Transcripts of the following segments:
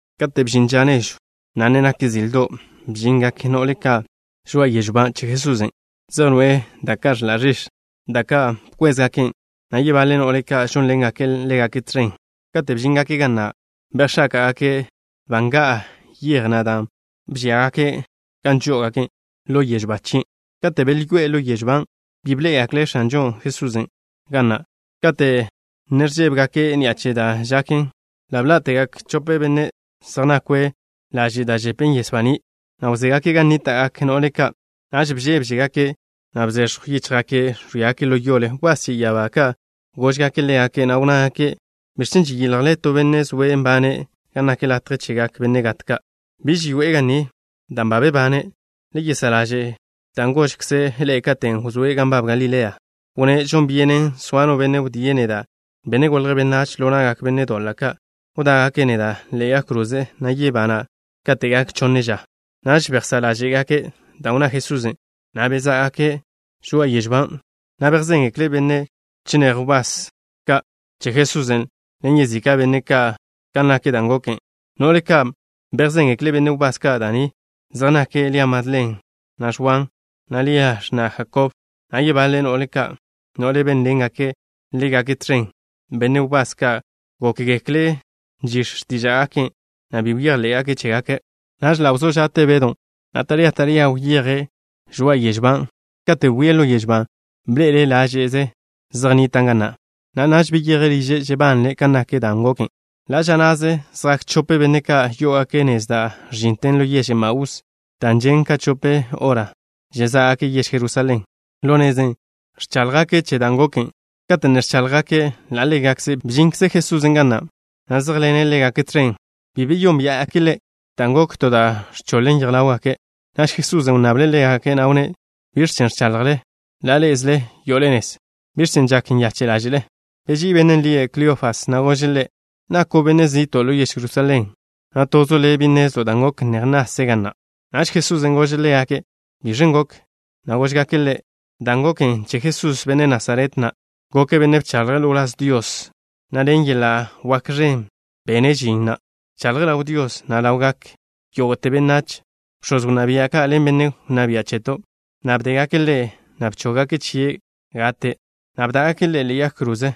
Kate' bžin ža nežw, na' ne nak zildo', bžingak no'le ka' žoa'a yežw ba che Jesusen'. Zej noe'e da' ka' ẕḻa' ẕix̱, da' ka' bkwézgaken', na' yebaḻe no'le ka' žónḻengake' ḻégake' tẕen. Katen' bžíngake' ga na', bejx̱áka'gake' ba nga'a yej na' dan' bžíagake' gan žó'ogake' ḻo yežw ba chien'. Kate' belyoé'e ḻo yežw ban', bi bḻé'egekle' X̱anžo Jesusen' ga na'. Kate' ne ẕžébegake' ni'a che da' žaken, ḻa' bḻá'tegak chope benne' zej nakwe' laže' da' žepen yes baní', na' wzégake' gan nníta'gak no'le ka'. Naž bžébžegake', na' bzex̱jw yíchjgake' ẕwíagake' ḻo yole. Wbás che ya'abá ka' góžgake' ḻégake', na' wnnágake': —¿Biẕ chen' žeyiljle to benne' zoe' nbane' ga nak latje chegak benne' gat ka'? Biž yoe'e ga ni, dan' ba bebane'. Le yesá' ḻaže' dan' gožkze' ḻe'e katen' wzóe' gan nbab Galilea. Wnné': “Žon byenen soa no benne' wdíe' neda', Benne' Golje' Benách, ḻo na'gak benne' doḻa' ka'. Wdá'gake' neda' ḻe'e yag kroze, na' yebana' kate' gak chonne ža.” Naž bejsá' ḻáže'gake' dan' wnná Jesusen', na' bezá'gake' žoa'a yežw ban', na' bejzéngekle' benne' chinéj wbás ka' che Jesusen', ḻen yezika' benne' ka', kan nak dan' goken. No'le ka' bejzéngekle' benne' wbás ka' da' ni, zej nake' Lia Madlen, na' Ẕwan, na' Lia, x̱na' Jakob, na' yebaḻe no'le ka', no'le bénḻengake' ḻégake' tẕen. Benne' wbás ka' gókgekle' nžix̱ x̱tíža'gake', na' bi bejḻé'gake' chégake'. Naž ḻa' wzó ža'te Bedw, na' taría taría wyeje' žoa'a yežw ban'. Katen' bwie' ḻo yežw ban', bḻe'ele' láže'ze zej nnitan' ga na', na' naž beyeje' liže' žebanle' kan nak dan' goken. Ḻa' ža na'ze zjak chope benne' ka' yó'ogake' nez da' ẕžinten ḻo yež Emaús, da' žen' ka chope hora žezá'gake' yež Jerusalén. Ḻo nezen' ẕcháḻjgake' che dan' goken. Kate' ne ẕcháḻjgake' ḻa' ḻégakze', bžinkze Jesusen' ga na', na' zéjḻene' ḻégake' tẕen. Bi beyónbia'gake' Ḻe' dan' gok to da' ẕchoḻen yej ḻáwgake'. Naž Jesusen' wnnable' ḻégake', na' wnné': —¿Biẕ chen ẕchaḻjle ḻa' ḻé'ezele yo'ole nez? ¿Biẕ chen' žak nyache' ḻáže'le? Beží'i bennen' lie' Kleofas, na' gože' Ḻe': —¿Nako' benne' zi'to' ḻo yež Jerusalén, na' tozo' le' bi nnezlo' dan' goken neje nase' ga na'? Naž Jesusen' gože' ḻégake': —¿Biẕen' goken? Góžgake' Ḻe': —Dan' goken che Jesús, benne' Nasaret na'. Goke' benne' bchaḻje' ḻo wláz Dios, na' ḻen yeḻa' wak ẕen bene' žin, na' bchaḻje' ḻaw Dios, na' ḻawgak yógo'te benách. Bx̱oz wnná bia' ka' ḻen benne' wnná bia' cheto' ka' bdégake' Ḻe', na' bchóggake' chie' gate', na' bdá'gake' Ḻe' ḻe'e yag kroze.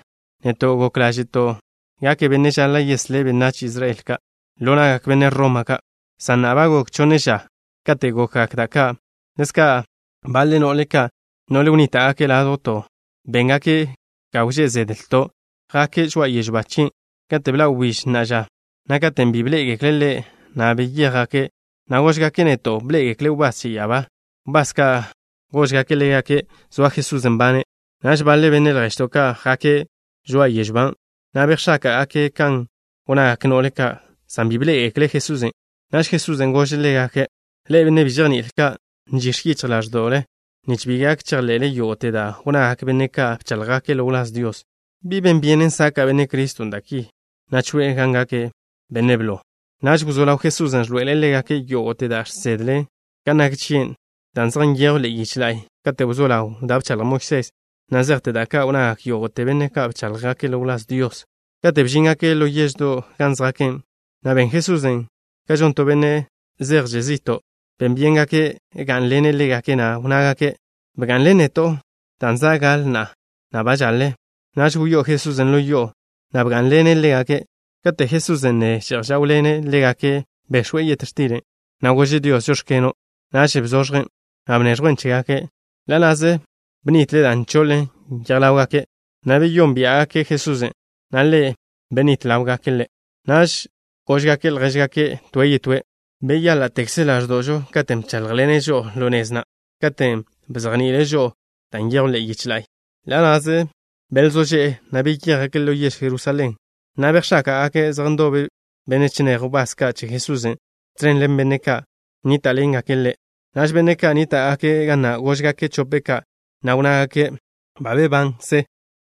Neto' gok ḻáže'to' gake' bennen' žaḻa' yeslé' benách Israel ka' ḻo na'gak benne' Roma ka', san na'a ba gok chonne ža kate' gokgak da' ka'. Ḻezka', baḻe no'le ka', no'le wnníta'gake' ládjwto', béngake' ga wžé' zedlto'. Jake' žoa'a yežw ba chien' kate' bḻa' wbíž na'a ža, na' katen' bi bḻé'egekle' Ḻe', na' beyéjgake', na' góžgake' neto' bḻé'egekle' wbás che ya'abá ka', wbás ka' góžgake' ḻégake' zoa Jesusen' nbane'. Naž baḻe benne' lježto' ka' jake' žoa'a yežw ban', na' bejx̱áka'gaken' kan wnnagak no'le ka', san bi bḻé'egekle' Jesusen'. Naž Jesusen' gože' ḻégake': —Ḻe'e, benne' bi žejní'il ka'. Nzižje yichj ḻáẕdo'le nich bi gak chejḻe'le yógo'te da' wnnagak benne' ka' bcháḻjgake' ḻo wláz Dios. ¿Bi ben byenen saka' Benne' Criston' da' ki, na' choe'e gan gake' benne' blo? Naž wzó ḻaw Jesusen' ẕḻoe'ele' ḻégake' yógo'te da' žsedle kan nak chie' da' zej nyejwn ḻe'e yich la'y, kate' wzó ḻaw da' bchaḻj Moisés, na' zejte da' ka' wnnagak yógo'te benne' ka' bcháḻjgake' ḻo wláz Dios. Katen' bžíngake' ḻo yeždo' gan zjake', na' ben Jesusen' kan žon to benne' zejže' zi'to'. Ben byéngake' gá'nḻene' ḻégake', na' wnnágake': —Bga'nḻen neto', dan' za' gaḻe na'a, na' ba žaḻe. Naž wyó'o Jesusen' ḻo yo'o, na' bgá'nḻene' ḻégake'. Kate' Jesusen' ne že'j žáwḻene' ḻégake', bex̱we' yet x̱til, na' gože' Dios: “Žóx̱keno'.” Naž bzoẕjen', na' bneẕjwen' chégake'. Ḻa' na'ze bnitle dan' bchoḻen yej ḻáwgake', na' beyónbia'gake' Jesusen', na' Ḻe' benitle' ḻáwgake'. Naž góžgake' ljéžgake' toe' yetóe': —Beyáḻa'tekze ḻáẕdo'žo katen' bcháḻjḻene' žo'o ḻo nez, na' katen' bzejni'ile' žo'o da' nyejwn ḻe'e yich la'y. Ḻa' na'ze belzó že'e, na' beyéjgake' ḻo yež Jerusalén, na' bejx̱áka'gake' zej ndobe benne' chinéj wbás ka' che Jesusen', tẕen ḻen benne' ka' nníta'ḻengake' ḻégake'. Naž benne' ka' nníta'gake' ga na' góžgake' chope' ka', na' wnnágake': —¡Ba bebankze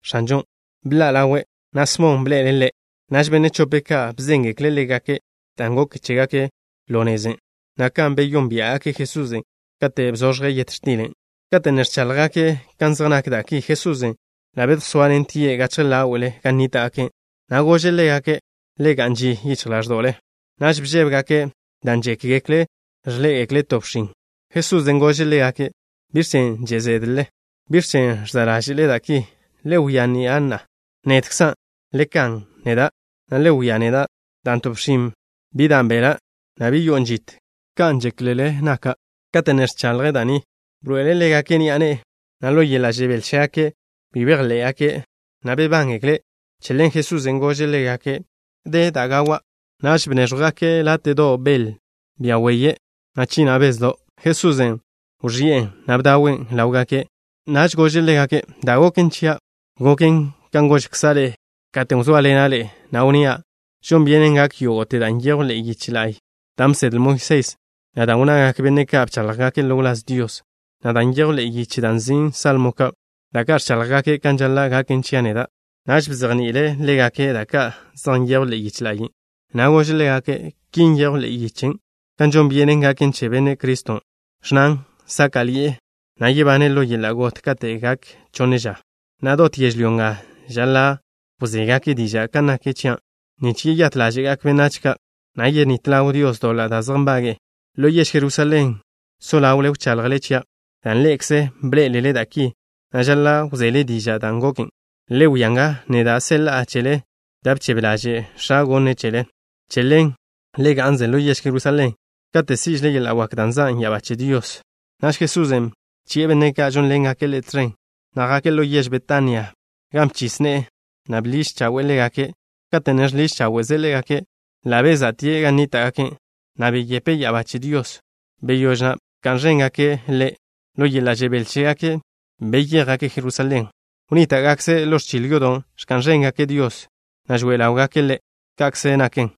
X̱anžon'! ¡Bḻa' ḻawe', na' Smon bḻe'ele' Ḻe'! Naž benne' chope' ka' bzéngekle' ḻégake' dan' goken chégake' ḻo nezen', na' kan beyónbia'gake' Jesusen' katen' bzoẕje' yet x̱tilen'. Kate' ne ẕcháḻjgake' kan zej nak da' ki, Jesusen' ḻa' bedjsoatie' gachje ḻáwe'le gan nníta'gake', na' gože' ḻégake': —Le ga'n ži yichj ḻáẕdo'le. Naž bžébegake' dan' žékgekle' ẕḻé'egekle' to bxin. Jesusen' gože' ḻégake': —¿Biẕ chen' že' zédlele? ¿Biẕ chen' ẕza' ḻáže'le da' ki? Le wia ni'a na'a. Nedkzan'. Le kan neda', na' le wia neda', dan' to bxin bi dan' beḻa', na' bi yo'on žit kan ẕḻé'ekzelele naken chia' neda'. Kate' ne ẕchaḻje' da' ni, bḻoe'ele' ḻégake' ni'a ne'e. Ḻo yeḻa' žebél chégake' bi bejḻé'gake', na' bebángekle'. Che ḻen Jesusen' gože' ḻégake': —¿De da' gawa'? Naž bnéẕjwgake' Ḻe' láte'do' bel, bia weye', na' china' bezdo'. Jesusen' wẕi'en, na' bdawen' ḻáwgake'. Naž gože' ḻégake': —Dan' goken chia' goken kan gožkza' ḻe'e katen' wzóaḻena' ḻe'e, na' wnnía': “Žon byenen gak yógo'te da' nyejw ḻe'e yich, da' bsedle Moisés, na' da' wnnagak benne' ka' bcháḻjgake' ḻo wláz Dios, na' da' nyejw ḻe'e yich da' nzin' Salmo Ka', da' ka' ẕcháḻjgaken kan žaḻa' gaken chia' neda'.” Naž bzejni'ile' ḻégake' da ka' zej nyejwn ḻe'e yich la'y, na' gože' ḻégake': —Ki nyejw ḻe'e yich kan žon byenen gaken che Benne' Criston', ẕnnan sáka'ḻi'e, na' yebane' ḻo yeḻa' got kate' gak chonne ža, na' dot yežlyó nga žaḻa' wzégake' diža' kan nak chia' neda' nich yeyát ḻáže'gak benách ka', na' yenít ḻaw Dios doḻa' da' zej nbage'e. Ḻo yež Jerusalén so ḻawle wchaḻjle chia', dan' ḻe'ekze bḻé'elele da' ki, na' žaḻa' wzele diža' dan' goken. Le wia nga, neda' seḻa'a chele da' bchebe ḻaže' X̱a' gonne' chele. Che ḻen le ga'nze ḻo yež Jerusalén kate' sí'žele yeḻa' wak, dan' zan' ya'abá che Dios. Naž Jesusen' bchi'e benne' ka' žónḻengake' Ḻe' tẕen, na' jake' ḻo yež Betania, gan bchis ne'e, na' bḻiž chawe'e ḻégake'. Kate' ne žḻiž cháwe'ze' ḻégake', ḻa' beza'tie' gan nníta'gake', na' beyepe' ya'abá che Dios. Wdé bka'n ẕéngake' Ḻe', ḻo yeḻa' žebél chégake' beyéjgake' Jerusalén. Wnníta'gakze' ḻo ẕchil yodo' ẕka'n ẕéngake' Dios, na' žoe ḻáwgake' Ḻe'. Ka'kze naken.